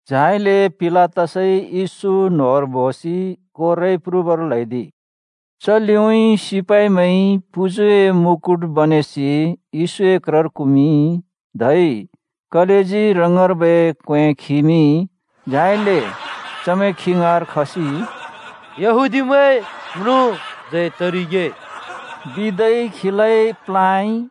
झाइले पिलातसइ येशू न्होंर बोसि कोर्राइ प्रुबर ल्‍हैदिइ। च लिउँइँ सिपाइमैंइ पुजुए मुकुट बनेसि येशूए क्रर कुमिंइ, धै कलेजी रङर्बै क्वें खिमिंइ। झाइले चमैं खी ङाँर खसि “येहूदिमैंए म्रुँ जय तरिगे!” बिदै खीलाइ प्लाँइ।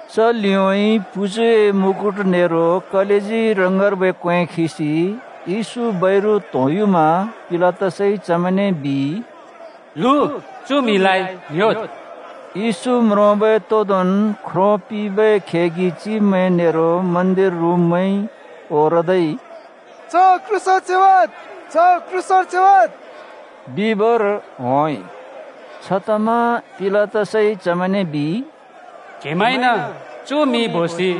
च लिउँइँ पुजुए मुकुट नेरो कलेजी रङर्बै क्वें खिसि येशू बैरु त्होंयुमा पिलातसइ चमैंने बिइ, “लु, चु म्हिलाइ ङ्‍ह्‍योद्।” येशू म्रोंबै तोदोंन् ख्रो पिंबै खेगि चिब्मैं नेरो मन्दिर रुँब्मैंइ ओरदै, “च क्रूसर च्योवाद्! च क्रूसर च्योवाद्! बिबर होंइ।” छतमा पिलातसइ चमैंने बिइ, “क्‍हेमैंइन चु म्हि बोसि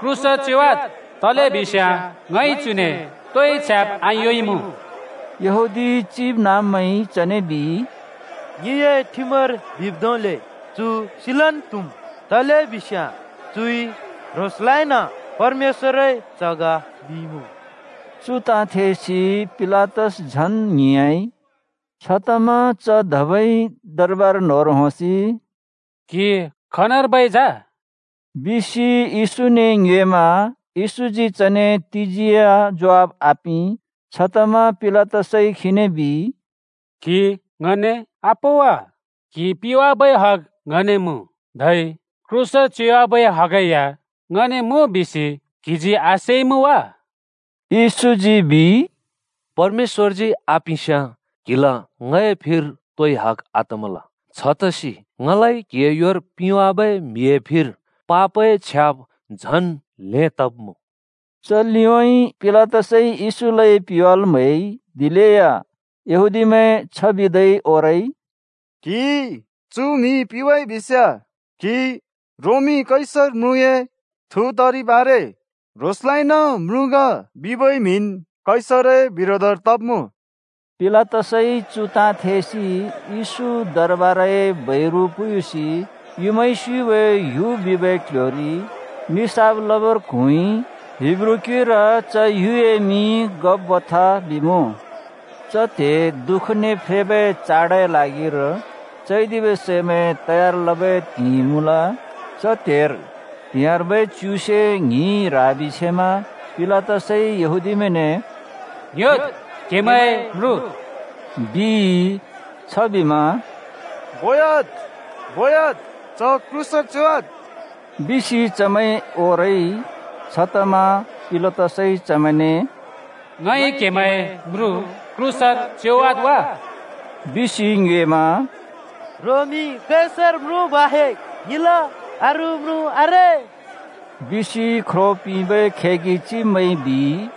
क्रूसर च्योवद्। तलेबिस्याँ ङइ चुने तोइ छ्याब् आयोंइमुँ।” यहूदी चिबनाँब्मैंइ चने बिइ, “ङिए ठिमर बिब् धोंले चु सिलन् त्हुम्। तलेबिस्याँ चुइ ह्रोंसलाइन परमेश्‍वरए च्ह ग बिइमुँ।” चु ताँ थेसि पिलातस झन् ङ्हिंयाँइ। छतमा च धबै दरबार न्‍होंर होंसि “क्‍हि खनर्बै जा?” बिसि येशूने ङ्योएमा येशूजी चने तिजी या ज्वाफ आपिं। छतमा पिलातसइ खीने बिइ, “क्हि ङने आपों वा? क्हि पिवाबै हग ङने मुँ, धै क्रूसर च्योवाबै हगै या ङने मुँ बिसि क्हिजी आसेइमुँ वा?” येशूजी बिइ, “परमेश्‍वरजी आपिंस्याँ क्हिला ङए फिर तोइ हग आतमल। छतसि ङलाइ क्हिए योर पिंवाबै म्हिए फिर पापए छ्याब् झन् ल्हें तब्मुँ।” च लिउँइँ पिलातसइ येशूलाइ पिवाल् म्हैइ। दिलेया यहूदीमैं छ बिदै ओरइ, “क्हिइ चु म्हि पिवाइ बिस्याँ क्हि रोमी कैसर म्रुँए थु तरिब् आरे। ह्रोंसलाइन म्रुँ ग बिबै म्हिन् कैसरए बिरोधर तब्मुँ।” पिलातसइ चु ताँ थेसि येशू दरबारए बैरु पुयुसि “युँमाइ स्युबै ह्‍यु” बिबै क्ल्ह्‍योरि निसाफ लबर क्हुँइ। (हिब्रू क्युइर च ह्‍युए मिं गब्‍बथा बिमुँ।) च त्हे दुःखने फ्रेबै चाडए ल्हागिर चैदिबै सैमैं तयार लबै त्हिंइ मुँल। च त्हेर त्हिंयाँर्बै च्युसे ङ्हिं ह्राबि छेमा। पिलातसइ यहूदीमैंने “ङ्‌ह्‍योद्, क्हेमैंए म्रुँ,” बिइ। छबिमा “बोयाद्, बोयाद्, च क्रूसर च्योवाद्!” बिसि चमैं ओरइ। छतमा पिलातसइ चमैंने “ङइ क्‍हेमैंए म्रुँ क्रूसर च्योवाद् वा?” बिसि ङ्योएमा “रोमी कैसर म्रुँ बाहेक् ङिला अरू म्रुँ आरे,” बिसि ख्रो पिंबै खेगि चिब्मैंइ बिइ।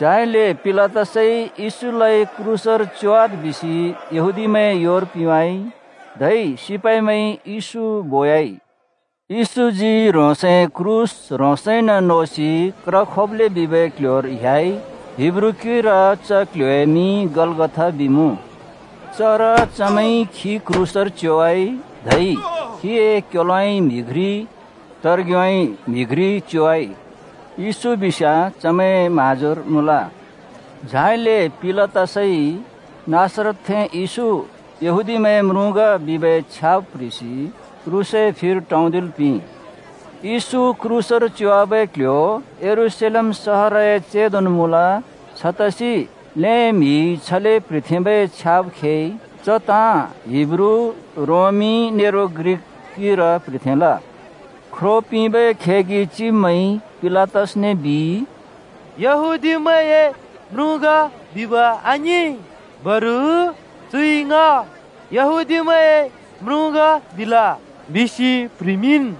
झाइले पिलातसइ येशूलाइ क्रूसर च्योवाद् बिसि यहूदीमैंए योर पिंवाइ। धै सिपाइमैंइ येशू बोयाइ। येशूजी ह्रोंसए क्रूस ह्रोंसइन नोसि क्र खोप्‍लें बिबै क्ल्ह्‍योर ह्‍याइ। (हिब्रू क्युइर च क्ल्ह्‍योए मिं गलगथा बिमुँ।) चर चमैंइ खी क्रूसर च्योवाइ धै खीए क्‍योलोउँइँ म्हि घ्रि त्हर्ग्योउँइँ म्हि घ्रि च्योवाइ। येशू बिस्याँ चमैंए म्हाँजोर मुँल। झाइले पिलातसइ “नासरतरथें येशू, यहूदीमैंए म्रुँ ग” बिबै छ्याब् प्ह्रिसि क्रूसए फिर टौंदिल् पिंइ। येशू क्रूसर च्योवाबै क्ल्ह्‍यो यरूशलेम सहरए चेंदोन् मुँल। छतसि ल्हें म्हिइ छले प्ह्रिथेंबै छ्याब् खेइ। च ताँ हिब्रू, रोमी, नेरो ग्रिक क्युइर प्ह्रिथेंल। ख्रो पिंबै खेगि चिब्मैंइ पिलातसने बिइ, “‘यहूदीमैंए म्रुँ ग’ बिब आङिं, बरु ‘चुइ ङ यहूदीमैंए म्रुँ ग बिल’ बिसि प्ह्रिमिंन्।”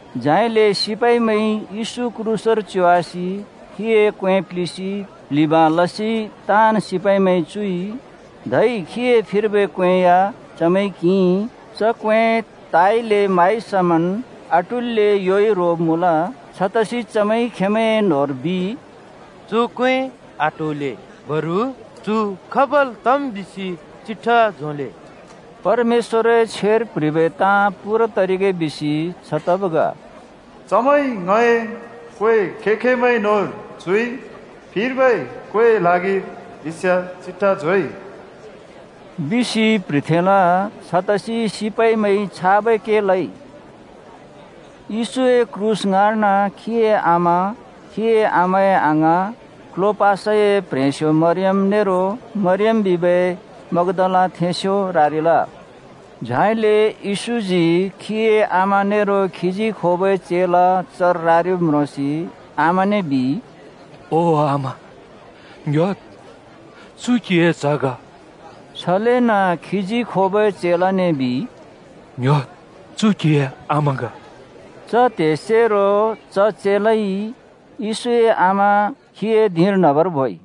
झाइले सिपाइमैंइ येशू क्रूसर च्योवासि खीए क्वें प्लिसि प्लिबाँ लसि ताँन् सिपाइमैंइ चुइ। धै खीए फिर्बै क्वें या चमैंइ किंइ। च क्वें ताइले माइ समन् आटुल्‍ले योइ रोब् मुँल। छतसि चमैंइ खेंमैंए न्होंर बिइ, “चु क्वें आट्होले, बरु चु खाबल् तम् बिसि चिट्ठा झोंले।” परमेश्‍वरए छ्वेर प्ह्रिबै ताँ पूरा तरिगे बिसि छ तब् ग। “चमैंइ ङए क्‍वें खें-खेंमैंए न्‍होंर चुइ, फिर्बै क्‍वेंए ल्हागिर बिस्याँ चिट्ठा झोंइ।” बिसि प्ह्रिथेंल। छतसि सिपाइमैंइ छाबै के लइ। येशूए क्रूस ङाँर्न खीए आमा, खीए आमाए अङाँ, क्लोपासए प्ह्रेंस्यो मरियम नेरो मरियम बिबै मग्दालाथेंस्यो रारिल। झाइले येशूजी खीए आमा नेरो खीजी खोबै चेला चर रारिब् म्रोंसि आमाने बिइ, “ओ आमा, ङ्‍ह्‍योद्, चु क्हिए च्ह ग!” छलेन खीजी खोबै चेलाने बिइ, “ङ्‍ह्‍योद्, चु क्हिए आमा ग!” च त्हेसेरो च चेलाइ येशूए आमा खीए धिंर न्हबर बोइ।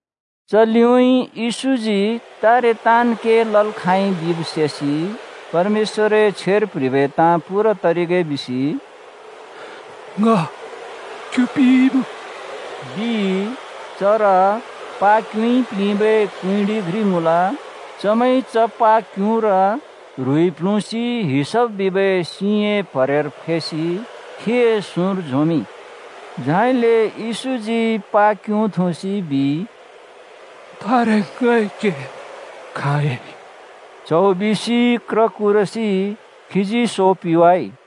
च लिउँइँ येशूजी तारे ताँन् के लल् खाँइ बिब् सेसि परमेश्‍वरए छ्वेर प्ह्रिबै ताँ पूरा तरिगे बिसि “ङ क्यु पिइ,” बिइ। चर प्हा क्युँइ प्लिंबै कुँइँडि घ्रि मुँल। चमैंइ च प्हा क्युँर ह्रुइ प्ल्हुँसि हिसप बिबै सिंए प्हरेर फैसि खीए सुँर झोंमिंइ। झाइले येशूजी प्हा क्युँ थुँसि बिइ, “तारे ङए के खाँयाँइ!” च्हौ बिसि क्र कुरसि खीजी सो पिवाइ।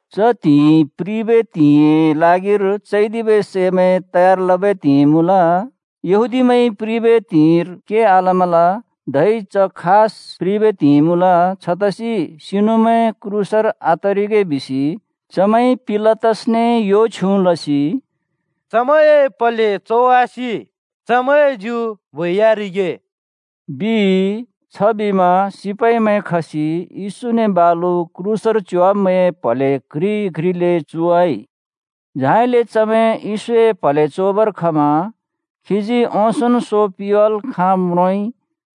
च त्हिंइ प्रिबै त्हिंइए ल्हागिर चैदिबै सैमैं तयार लबै त्हिंइ मुँल। यहूदीमैंइ प्रिबै त्हिंइर के आलमल। धै च खास प्रिबै त्हिंइ मुँल। छतसि सिनुमैं क्रूसर आतरिगे बिसि चमैंइ पिलातसने यो छ्युँ लसि “चमैंए प्हले चोवासि चमैंए ज्यु बोयारिगे,” बिइ। छबिमा सिपाइमैं खसि येशूने बालु क्रूसर च्योवाब्मैंए प्हले घ्रि घ्रिले चोवाइ। झाइले चमैं येशूए प्हले चोबर खमा खीजी ओंसोंन् सो पिवाल् खाँब् म्रोंइ।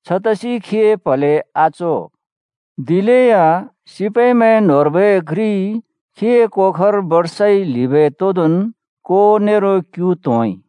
छतसि खीए प्हले आचो। दिलेया सिपाइमैं न्होंर्बै घ्रिइ खीए कोखर बर्साइ ल्हिबै तोदोंन् को नेरो क्यु त्होंइ।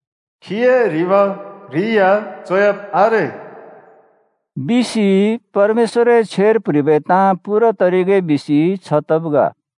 “खीए ह्रिब घ्रि या चोयाब् आरे।” बिसि परमेश्‍वरए छ्वेर प्ह्रिबै ताँ पूरा तरिगे बिसि छ तब् ग।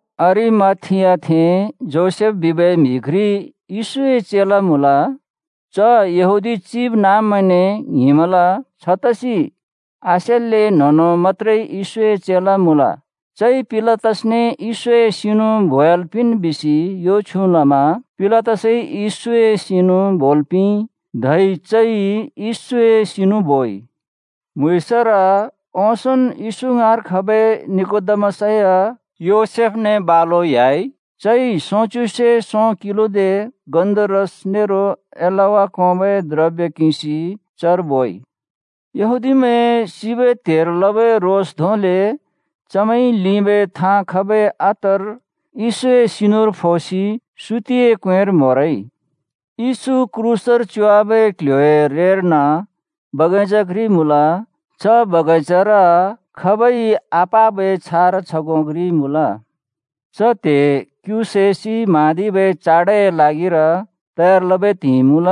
अरिमाथियाथें योसेफ बिबै म्हि घ्रि येशूए चेला मुँल। च यहूदी चिबनाँब्मैंने ङ्हिंमल छतसि आसेल्‍ले न्हों-न्हों मत्‍त्रे येशूए चेला मुँल। चइ पिलातसने येशूए सिनु बोयाल् पिंन् बिसि यो छ्युँ लमा पिलातसइ येशूए सिनु बोल् पिंइ। धै चइ येशूए सिनु बोइ। म्हुँइँसर ओंसोंन् येशू ङाँर खबै निकोदेमस या योसेफने बालु ह्‍याइ। चइ सोंच्युसे सों किलोदे गन्धरस नेरो एलवा कोंबै द्रब्य किंसि चर बोइ। यहूदीमैंए सिबै त्हेर लबै रोस् धोंले चमैंइ लिंबै थाँ खबै अत्तर येशूए सिनुर फोसि सुतिए क्वेंर म्होरइ। येशू क्रूसर च्योवाबै क्ल्ह्‍योए रेर्न बगैंचा घ्रि मुँल। च बगैंचार खाबइ आपाबै छारा छगों घ्रि मुँल। च त्हे क्‍यु सैसि म्हाँदिबै चाडए ल्हागिर तयार लबै त्हिंइ मुँल।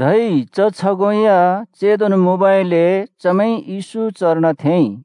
धै च छगों या चेंदोन् मुँबइले चमैंइ येशू चर्न थेंइ।